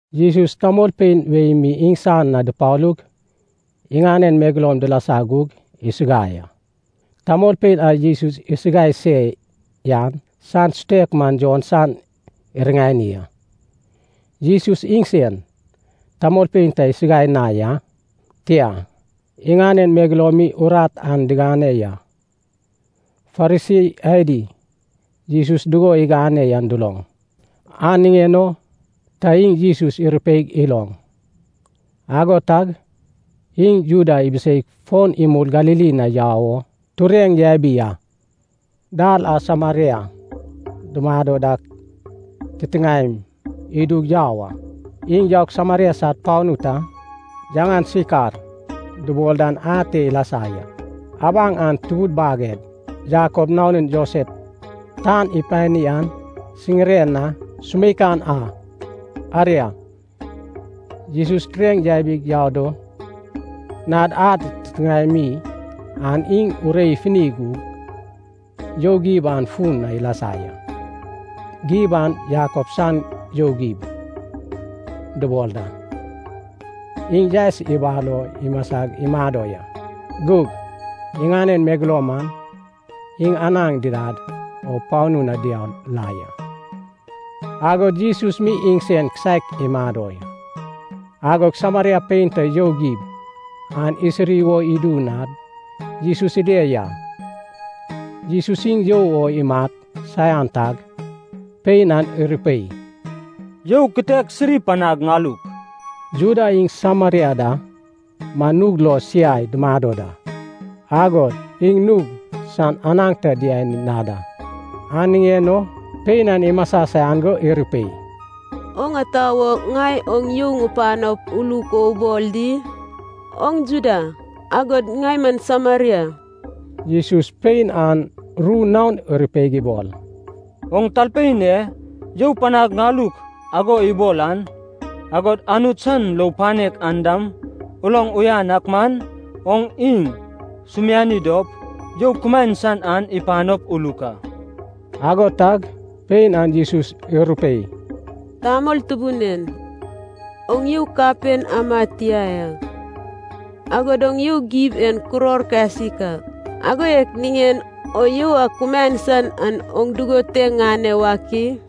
Jesus tamolpein wei mi iŋsan na dupalug iŋanen megeloum dilasa gug isuguai a. Tamolpein a Jesus isuguai se yan san sutek man Jon san iriŋani a. (Jesus iŋsen tamolpein ta isuguai na ya. Tia, iŋanen megeloum mi urat an digane ya.) Farisi adi Jesus dugo igane yan duloŋ, an niŋen o ta iŋ Jesus irupei iloŋ. Ago tag iŋ Judea ibiseig fon imul Galili na yau o tureŋ yabi a. Dal an Sameria dumado dak titiŋaem idug yau a. Iŋ yaug Sameria sad panu ta, yaŋan Sikar dubol dan ate ilasa ya. Abaŋ an tubud baged Jakob nanun Josef tan ipani an siŋiren na sumeikan a. Aria, Jesus tureŋ yabig yau do nad ad titiŋae mi an iŋ urei ifuni gug, you gib an fun na ilasa ya. Gib an Jakob san you gib dubol da. Iŋ yaes ibal o imasig imado ya. Gug iŋanen megeloum man iŋ anaŋ didad o panu na diau la ya, agod Jesus mi iŋsen kisaek imado. Agog Sameria pein ta you gib an isiri wo idu nad Jesus ile ya. Jesus iŋ you o imat saian tag, pein an irupei, “You kitek sirip panag ŋaluk.” Juda iŋ Sameria da man nug lo siai dumado da, agod iŋ nug san anaŋ ta diani na da. An niŋen o pein an imasa saian go irupei, “Oŋ ata wo ŋai oŋ you ŋupanop, uluk o ubol di? Oŋ Juda, agod ŋai man Sameria.” Jesus pein an ru naon irupeig ibol, “Oŋ talpein e, ‘you panag ŋaluk’ ago ibol an, agod Anut san lou panek an dam uloŋ uyan ak man, oŋ iŋ sumiani dop, you kumaen san an ipanop uluk a.” Ago tag pein an Jesus irupei, “Tamol tubun en, oŋ you kapen ama tia ya. Agod you gib en kuror kasik a. Ago yak niŋen o you a kumaen san an oŋ dugon te ŋane wak i?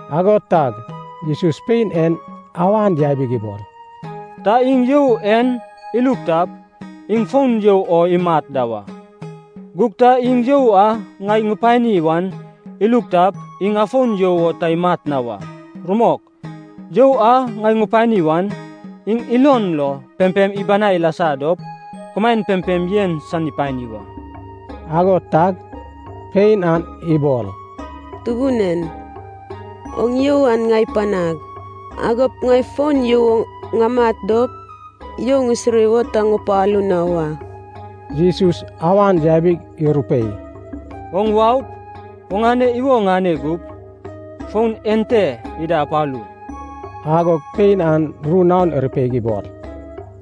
Ago tag Jesus pein en awan yabig ibol, “Ta iŋ you en iluk tap, iŋ fon you o imat da wa. Gug ta iŋ you a ŋai ŋupani wan iluk tap, iŋ afon you o ta imat na wa. Rumok, you a ŋai ŋupani wan, iŋ ilon lo pempem ibanai ilasa dop, kumaen pempem yen san ipani wa.” Ago tag pein an ibol, “Tubun en, oŋ you an ŋai panag. Agop ŋai fon you o ŋamat dop, you ŋisiri wo ta ŋupalu na wa.” Jesus awan yabig irupei, “Oŋ waup, oŋane iwo ŋane gup, fon ente ida apalu.” Agog pein an ru naon irupeig ibol,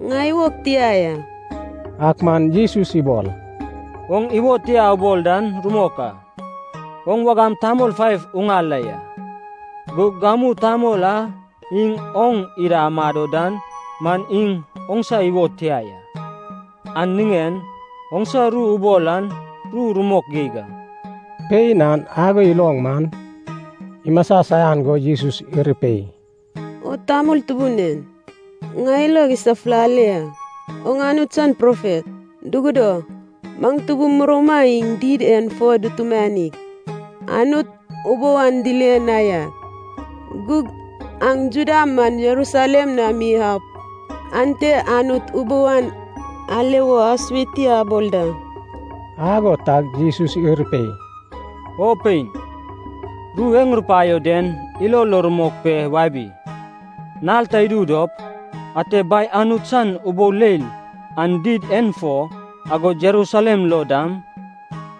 “Ŋai iwog tia ya.” Ak man Jesus ibol, “Oŋ iwo tia ubol dan rumok a. Oŋ wagam tamol faiv uŋal la ya. Gug gamu tamol a iŋ oŋ ida amado dan man iŋ oŋsa iwo tia ya, an niŋen oŋsa ru ubol an ru rumok geig a.” Pein an ago iloŋ man, imasa saian go Jesus irupei, “O tamol tubun en, ŋai ilog isafulale ya. Oŋ Anut san profet. Dugudo, maŋ tubum murouma iŋ did en fo dutumanig, Anut ubou an dile na ya. Gug aŋ Juda man Jerusalem na mi aup, ante Anut ubou an ale wo asue ti abol da.” Ago tag Jesus irupei, “O pein, ru e ŋurupaio den ilo lo rumok pe wabi. Nal ta idu dop, ate Bai Anut san ubou leil an did en fo, agod Jerusalem lo dam,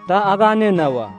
ta agane na wa.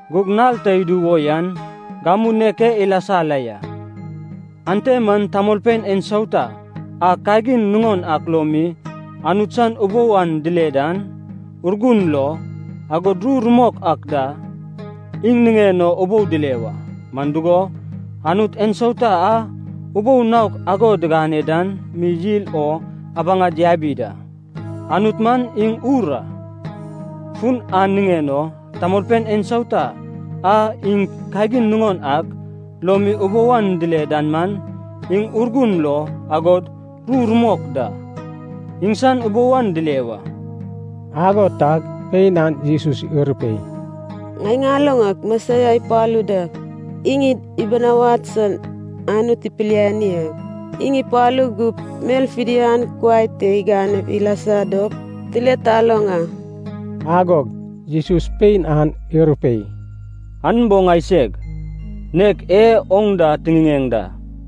Gug nal ta idu wo yan gamu nek e ilasa la ya, ante man tamolpein ensauta a kagin nuŋon ak lo mi Anut san ubou an dile dan, Urgun lo, agod ru rumok ak da, iŋ niŋen o ubou dile wa. Man dugo, Anut ensauta a ubou naok ago digane dan mi yil o abaŋad yabi da. Anut man iŋ Ur a. Fun an niŋen o, tamolpein ensauta a iŋ kagin nuŋon ak lo mi ubou an dile dan man, iŋ Urgun lo, agod ru rumok da, iŋsan ubou an dile wa.” Ago tag pein an Jesus irupei, “Ŋai ŋaloŋ ak, Mesias ipalu da. Iŋ id ibinawad san Anut ipiliani a. Iŋ ipalu gup, mel fidian kuai te igane ilasa dop tile taloŋ a.” Agog Jesus pein an irupei, “An bo ŋaiseg, nek e oŋ da tiŋiŋeŋ da.”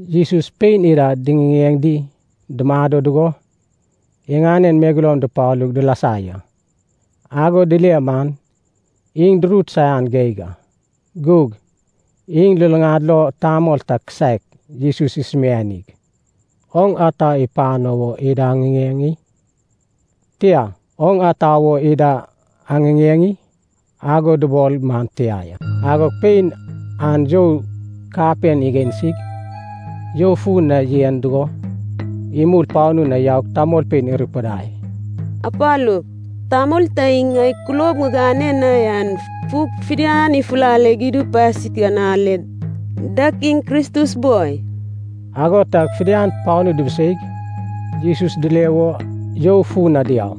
Jesus pein ida diŋiŋeŋ di dumado dugo iŋanen megeloum dupalug dilasa ya. Ago dile man iŋ durut saian geig a. Gug iŋ luluŋad lo tamol ta kisaek Jesus isumianig, “Oŋ ata ipano wo ida aŋiŋeŋ i?” tia, “Oŋ ata wo ida aŋiŋeŋ i?” ago dubol man tia ya. Agog pein an you kapen igansig you fun na yen dugo, imul panu na yaug tamolpein irupudai, “Apalup, tamol ta iŋ ŋai kulob ŋigane na yan fug fidian ifulale idu pasik an ale. Dag iŋ Kristus boi?” Ago tag fidian panu dubuseig, Jesus dile wo you fu na diau.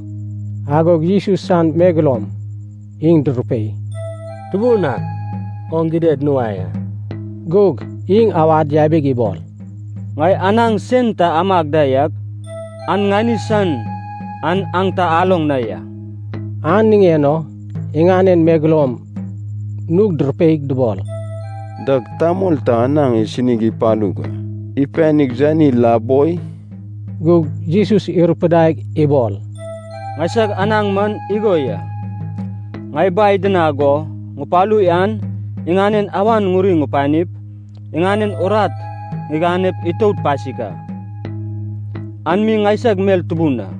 Agog Jesus san megeloum iŋ durupei, “Tubun ak, oŋ gidad nuai a.” Gug iŋ awad yabig ibol, “Ŋai anaŋ sen ta amag da yak, an ŋani san an aŋ ta aloŋ na ya.” An niŋen o iŋanen megeloum nug durupeig dubol, “Dag tamol ta anaŋ isini ipalug ipanig yani la boi?” Gug Jesus irupidaig ibol, “Ŋaisag anaŋ man igo ya, ŋai Bai idinag go ŋupalu yan iŋanen awan ŋuri ŋupanip, iŋanen urat ŋiganep itout pasik a, an mi ŋaisag mel tubun a.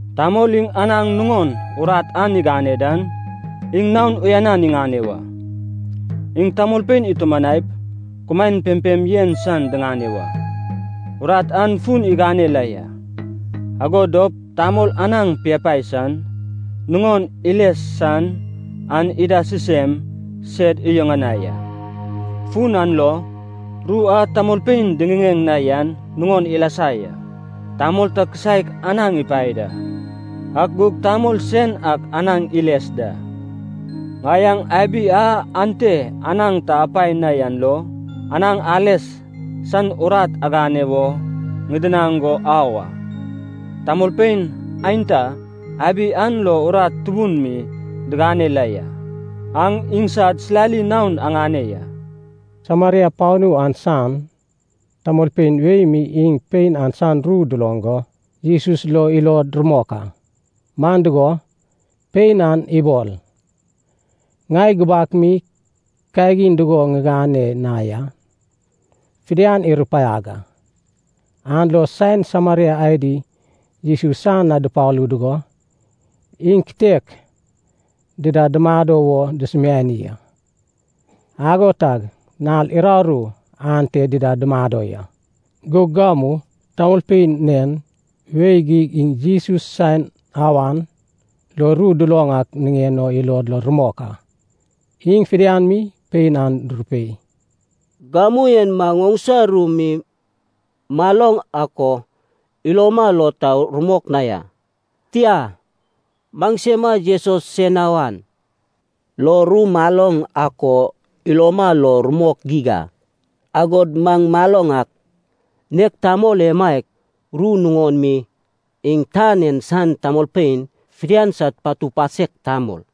Tamol iŋ anaŋ nuŋon urat an igane dan, iŋ naon uyanan iŋane wa. Iŋ tamolpein itumanaip, kumaen pempem yen san diŋane wa. Urat an fun igane la ya. Ago dop tamol anaŋ piapae san, nuŋon iles san an ida sisem sed iyuŋanai a. Fun an lo, ru a tamolpein diŋiŋeŋ na yan nuŋon ilasa ya, ‘Tamol ta kisaek anaŋ ipae da, ak gug tamol sen ak anaŋ iles da.’ Ŋai aŋ abi a ante anaŋ ta apae na yan lo, anaŋ ales san urat agane wo ŋidinaŋ go au a. Tamolpein aenta abi an lo urat tubun mi digane la ya. Aŋ iŋsad silali naon aŋane ya.” Sameria panu an san tamolpein wei mi iŋ pein an san ru duloŋ go, Jesus lo ilod rumok a. Man dugo, pein an ibol, “Ŋai gubak mi kagin dugo ŋigane na yan fidian irupaiag a.” An lo saen Sameria adi Jesus san na dupalu dugo, iŋ kitek dida dumado wo dusumiani a. Ago tag nal uraru ante dida dumado ya. Gug gamu tamolpein nen wei geig iŋ Jesus sen awan lo ru duloŋ ak niŋen o ilod lo rumok a. Iŋ fidian mi pein an durupei, “Gamu en maŋ oŋsa ru mi maloŋ ak o iloma lo ta rumok na ya. Tia, maŋsema Jesus sen awan lo ru maloŋ ak o iloma lo rumok geig a. Agod maŋ maloŋ ak, nek tamol emaiak, rumok nuŋon mi, iŋ tan en san tamolpein fidian sad patu pasek tamol.”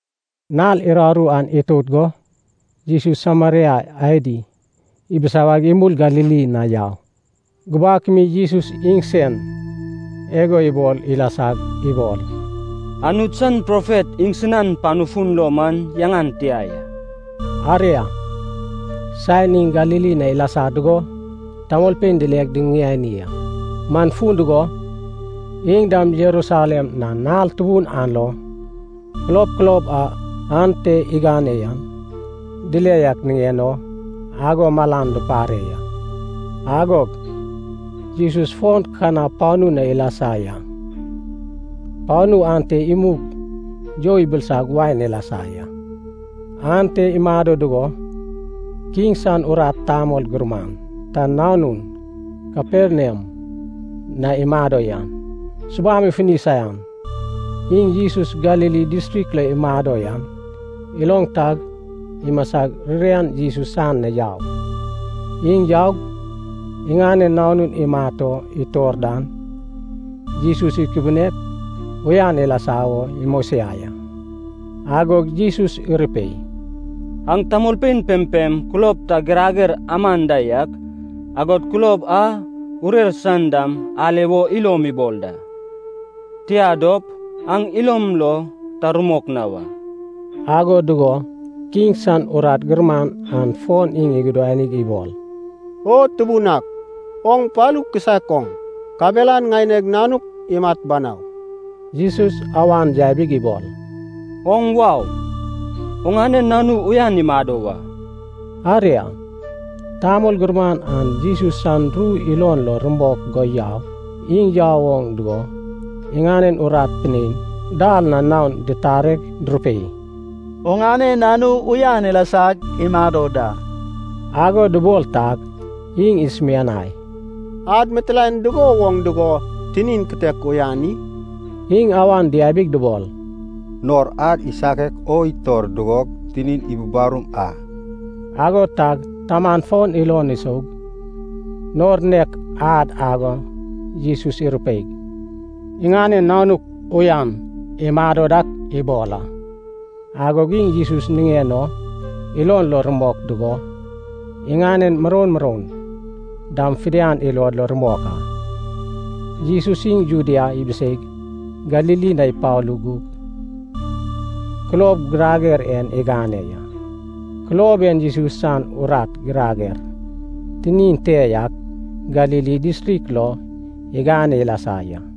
Nal uraru an itout go, Jesus Sameria adi ibisawaig imul Galili na yau. Gubak mi Jesus iŋsen igo ibol ilasag ibol, “Anut san profet iŋsinan panu fun lo man yaŋan tia ya.” Aria, saen iŋ Galili na ilasa dugo, tamolpein dileg duyuŋani a. Man fun dugo, iŋ dam Jerusalem na nal tubun an lo, kulob kulob a ante igane yan dile yak niŋen o, ago malan dupare ya. Agog Jesus fon Kana panu na ilasa ya. Panu ante imug you ibilisag wain ilasa ya. Ante imado dugo, kiŋ san urat tamol gurman ta nanun Kaperniam na imado yan, subam ifuni saian. Iŋ Jesus Galili distrik lo imado yan iloŋ tag, imasag ririan Jesus san na yau. Iŋ yaug, iŋanen nanun imat o itor dan, Jesus ikubunep uyan ilasa wo imosiai a. Agog Jesus irupei, “Aŋ tamolpein pempem kulob ta girager aman da yak, agod kulob a urer san dam ale wo ilom ibol da. Tia dop, aŋ ilom lo ta rumok na wa.” Ago dugo kiŋ san urat gurman an fon iŋ igudanig ibol, “O Tubun ak, oŋ palu kisaek oŋ. Kabelan ŋaineg nanuk imat banau.” Jesus awan yabig ibol, “Oŋ wau, oŋane nanu uyan imado wa.” Aria, tamol gurman an Jesus san ru ilon lo rumok go yau. Iŋ yau oŋ dugo, iŋanen urat pinein dal na naon ditareg durupei, “Oŋane nanu uyan ilasag imado da.” Ago dubol tag, iŋ isumianai, “Ad mitilaen dugo woŋ dugo tinin kitek uyan i?” Iŋ awan diabig dubol, “Nor ad isakek o itor dugo, tinin ibubarum a.” Ago tag taman fon ilon isoug, nor nek ad ago Jesus irupeig, iŋanen nanuk uyan imado dak ibol a. Agog iŋ Jesus niŋen o ilon lo rumok dugo, iŋanen muroun muroun dam fidian ilod lo rumok a. Jesus iŋ Judea ibiseig Galili na ipalu gug, kulob girager en igane ya. Kulob en Jesus san urat girager tinin te yak Galili distrik lo igane ilasa ya.